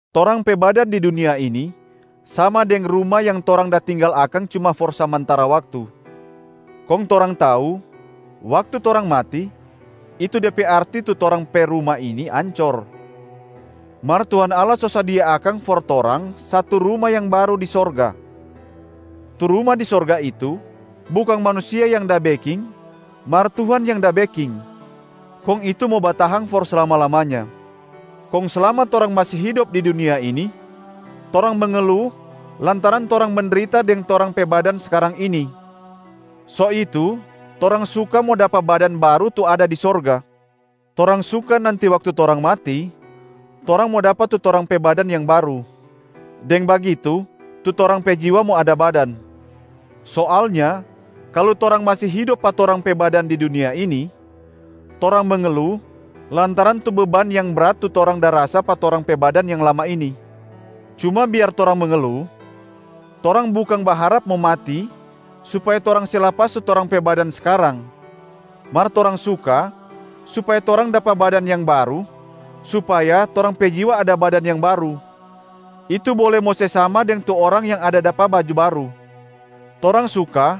Torang pe badan di dunia ini sama deng ruma yang torang da tinggal akang cuma for samantara waktu. Kong torang tau, waktu torang mati, itu de pe arti tu torang pe ruma ini ancor, mar Tuhan Allah so sadia akang for torang satu ruma yang baru di sorga. Tu ruma di sorga itu, bukang manusia yang da beking mar Tuhan yang da beking, kong itu mo batahang for slama-lamanya. Kong slama torang masi hidop di dunia ini torang mengelu lantaran torang mendrita deng torang pe badan skarang ini, so itu torang suka mo dapa badan baru tu ada di sorga. Torang suka nanti waktu torang mati, torang mo dapa tu torang pe badan yang baru. Deng bagitu tu torang pe jiwa mo ada badan. Soalnya kalu torang masi hidop pa torang pe badan di dunia ini, torang mengelu lantaran tu beban yang brat tu torang da rasa pa torang pe badan yang lama ini. Cuma biar torang mengelu, torang bukang baharap mo mati supaya torang se lapas tu torang pe badan skarang, mar torang suka supaya torang dapa badan yang baru supaya torang pe jiwa ada badan yang baru, itu bole mo se sama deng tu orang yang da dapa baju baru. Torang suka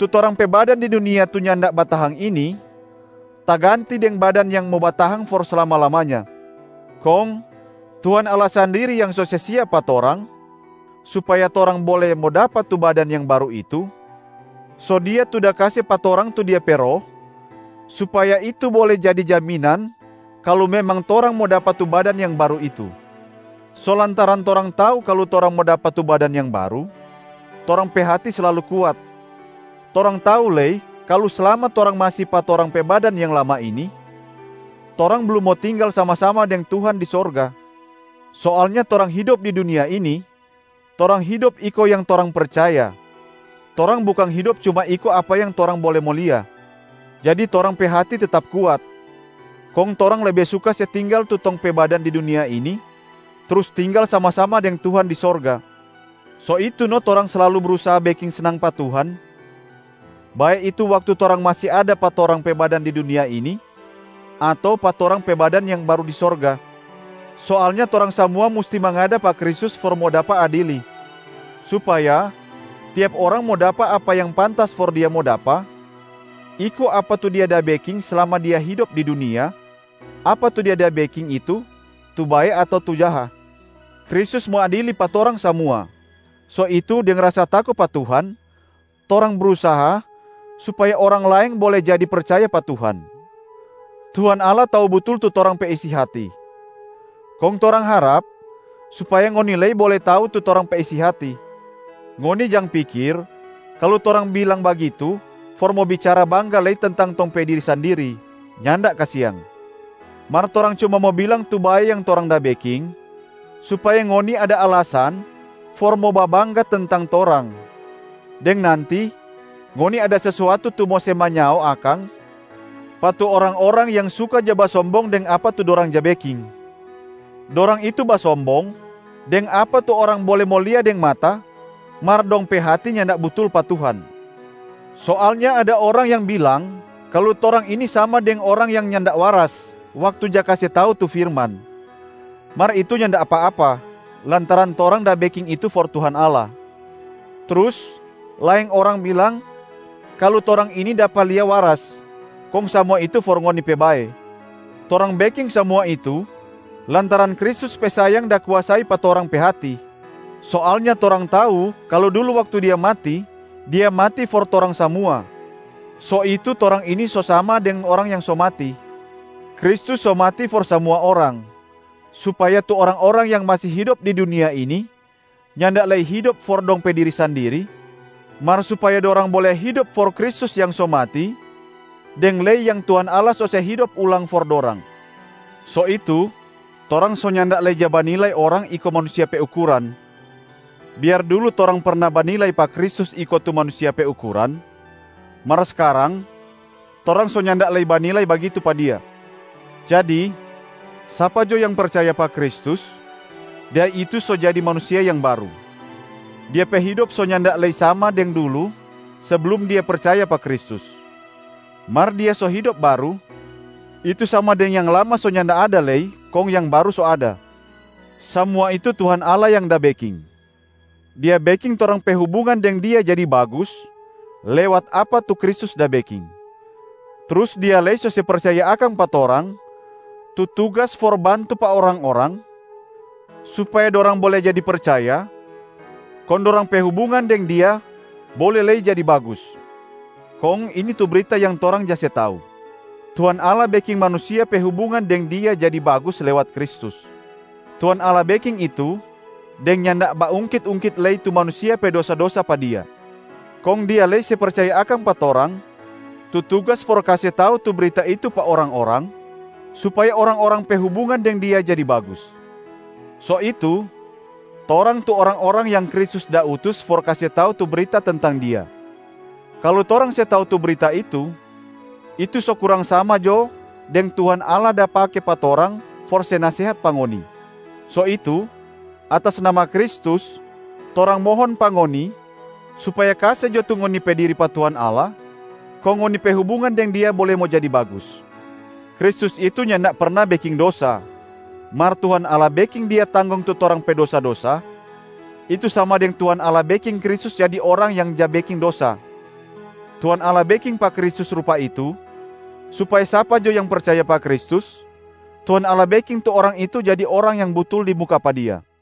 tu torang pe badan di dunia tu nyanda batahang ini taganti deng badan yang mo batahang for slama-lamanya. Kong Tuhan Allah sandiri yang so se siap pa torang supaya torang bole mo dapa tu badan yang baru itu, so Dia tu da kase pa torang tu Dia pe Roh supaya itu bole jadi jaminan kalu memang torang mo dapa tu badan yang baru itu. So lantaran torang tau kalu torang mo dapa tu badan yang baru, torang pe hati slalu kuat. Torang tau lei kalu slama torang masi pa torang pe badan yang lama ini, torang blum mo tinggal sama-sama deng Tuhan di sorga. Soalnya torang hidop di dunia ini, torang hidop iko yang torang percaya, torang bukang hidop cuma iko apa yang torang bole mo lia. Jadi torang pe hati tetap kuat, kong torang lebe suka se tinggal tu tong pe badan di dunia ini trus tinggal sama-sama deng Tuhan di sorga. So itu no torang slalu brusaha beking snang pa Tuhan, bae itu waktu torang masi ada pa torang pe badan di dunia ini ato pa torang pe badan yang baru di sorga. Soalnya torang samua musti mangada pa Kristus for mo dapa adili, supaya tiap orang mo dapa apa yang pantas for dia mo dapa, iko apa tu dia da beking slama dia hidop di dunia, apa tu dia da beking itu tu bae ato tu jaha. Kristus mo adili pa torang samua, so itu deng rasa tako pa Tuhan, torang brusaha supaya orang laeng bole jadi percaya pa Tuhan. Tuhan Allah tau butul tu torang pe isi hati, kong torang harap supaya ngoni lei bole tau tu torang pe isi hati. Ngoni jang pikir kalu torang bilang bagitu for mo bicara bangga lei tentang tong pe diri sandiri, nyanda kasiang. Mar torang cuma mo bilang tu bae yang torang da beking supaya ngoni ada alasan for mo babangga tentang torang, deng nanti ngoni ada sesuatu tu mo se manyao akang pa tu orang-orang yang suka ja basombong deng apa tu dorang ja beking. Dorang itu basombong deng apa tu orang bole mo lia deng mata mar dong pe hati nyanda butul pa Tuhan. Soalnya ada orang yang bilang kalu torang ini sama deng orang yang nyanda waras waktu ja kase tau tu firman, mar itu nyanda apa-apa lantaran torang da beking itu for Tuhan Allah. Trus laeng orang bilang kalu torang ini dapa lia waras, kong samua itu for ngoni pe bae. Torang beking samua itu lantaran Kristus pe sayang da kuasai pa torang pe hati. Soalnya torang tau kalu dulu waktu Dia mati, Dia mati for torang samua, so itu torang ini so sama deng orang yang so mati. Kristus so mati for samua orang, supaya tu orang-orang yang masi hidop di dunia ini nyanda lei hidop for dong pe diri sandiri, mar supaya dorang bole hidop for Kristus yang so mati deng lei yang Tuhan Allah so se hidop ulang for dorang. So itu, torang so nyanda lei ja banilai orang iko manusia pe ukuran. Biar dulu torang perna banilai pa Kristus iko tu manusia pe ukuran, mar skarang torang so nyanda lei banilai bagitu pa Dia. Jadi sapa jo yang percaya pa Kristus, dia itu so jadi manusia yang baru. Dia pe hidop so nyanda lei sama deng dulu seblum dia percaya pa Kristus, mar dia so hidop baru, itu sama deng yang lama so nyanda ada lei kong yang baru so ada. Samua itu Tuhan Allah yang da beking. Dia beking torang pe hubungan deng Dia jadi bagus lewat apa tu Kristus da beking. Trus Dia lei so se percaya akang pa torang tu tugas for bantu pa orang-orang supaya dorang bole jadi percaya kong dorang pe hubungan deng Dia bole lei jadi bagus. Kong ini tu brita yang torang ja se tau: Tuhan Allah beking manusia pe hubungan deng Dia jadi bagus lewat Kristus. Tuhan Allah beking itu deng nyanda baungkit-ungkit lei tu manusia pe dosa-dosa pa Dia. Kong Dia lei se percaya akang pa torang tu tugas for kase tau tu brita itu pa orang-orang supaya orang-orang pe hubungan deng Dia jadi bagus. So itu, torang tu orang-orang yang Kristus da utus for kase tau tu brita tentang Dia. Kalu torang se tau tu brita itu, itu so kurang sama jo deng Tuhan Allah da pake pa torang for se nasehat pa ngoni. So itu, atas nama Kristus, torang mohon pa ngoni supaya kase jo tu ngoni pe diri pa Tuhan Allah kong ngoni pe hubungan deng Dia bole mo jadi bagus. Kristus itu nyanda perna beking dosa, mar Tuhan Allah beking Dia tanggong tu torang pe dosa-dosa, itu sama deng Tuhan Allah beking Kristus jadi orang yang ja beking dosa. Tuhan Allah beking pa Kristus rupa itu supaya sapa jo yang percaya pa Kristus, Tuhan Allah beking tu orang itu jadi orang yang butul di muka pa Dia.